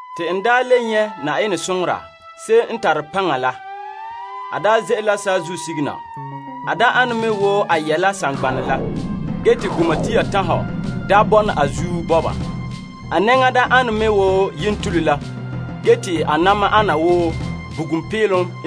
Te n le nyɛ' Yenɛ soŋora ayema n tare paŋa la. A ze'ele la saazuo sige na. A ane me wo a yɛ la saŋgbanɛ la te gumatia tanhɔ daa bɔna a zuin. A nɛŋa an wo yentule la ge te a na'ma ana wo bugum peelom.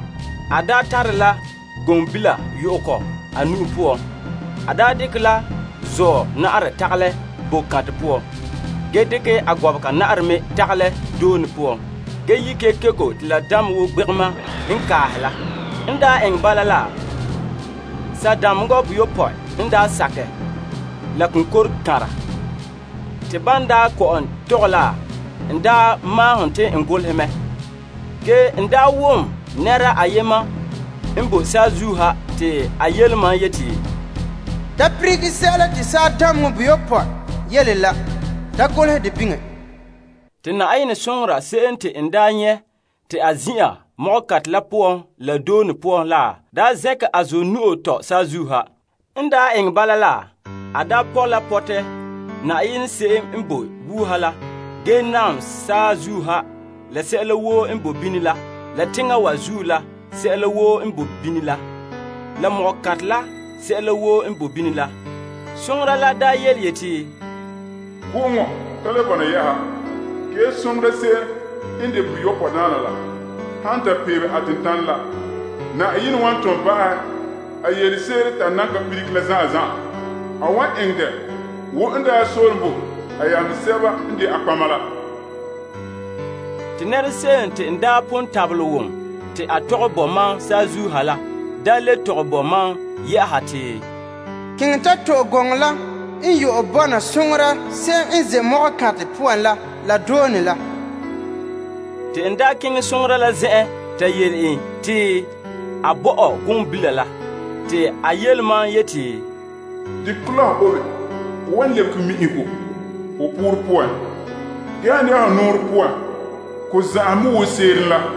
A tare la ganpeka yu'ɛ kɔ a nu'o poan. A dekɛ la zuɔ na'arɛ tagalɛ ko'kantɛ poan, ge dekɛ a gɔbega na'arɛ me tagalɛ doone poan, ge yi' kekeko te la damɛ wo gbegema n kaahɛ la. N eŋɛ bala la, saadameŋa boyopɔe n sakɛ la konkokanra. Te ban daa tɔgɛ la, n maahene te n golehɛ mɛ. Ge mam daa wom la konkore saazuo ha yele mam yeti, Da lilige sɛla te saadameŋa boyopɔe yele la ge da golehɛ dɛ biŋe. Te Yenɛ soŋora se'em te n nyɛ' te a ze'a ko'kantɛ la poan la doone poan la, zɛnkɛ a zuɔ nu'o tɔ saazuo ha. N daa eŋɛ bala la, a pɔ' la pɔtɛ Yenɛ se'em n boe wuuha la gee naam saazuo ha la sɛla woo n boe bini la, la teŋa wa zuo la sɛla woo n bo bini la, la ko'kantɛ la sɛla woo n bo bini la. Soŋora la yeti, Go'oŋɔ ka le bɔna yɛ'ɛha. Ge soŋora se'em n de boyopɔe daana la han ta peebe a tentanɛ la, Yenɛ wan tom ba'ahɛ a yelese'ere te a nan ka lilige la zan'an zan'an. A wan eŋɛ dɛ wo n daa soolom bo a yamehe sɛba n de a nɔtɔgɔheba la. Te konkore la te n pon wom saazuo ha la daa le tɔgɛ boe mam te, Kiŋɛ ta to'e ganɛ la n yu'ɛ bɔna soŋora se'em n ze' ko'kantɛ poan la la doone la. Te n daa keŋɛ soŋora la zen'en ta yele en te a bo mam ganpeka la. Te a yele mam yeti, Dekɛ kɔ la ho obe. Ko wan lebege mi'ihego ho poorɛ poan. Ge han de'a ho nɔɔrɛ poan, ko zan'anhen mɛ wo seerom la.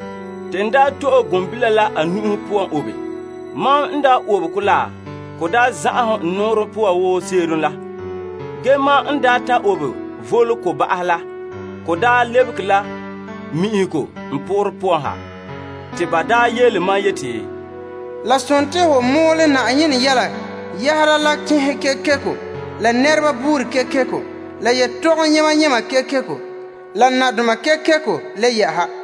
Te n to'e ganpeka la a nu'o poan obe. Mam n obe kɔ la, ko daa zan'anhen n nɔɔrɛ poan wo seerom la. Ge mam n daa ta obe voole ko ba'ahɛ la, ko daa lebege la mi'ihego n poorɛ poan ha. Te ba daa yele mam yeti, La sontii ho mɔɔlɛ Yenɛ yɛla yɛhera la tenhen kekeko la nɛreba buuri buuri kekeko, la yetɔgom yema yema kekeko, la nadoma kekeko le yɛ'ɛha.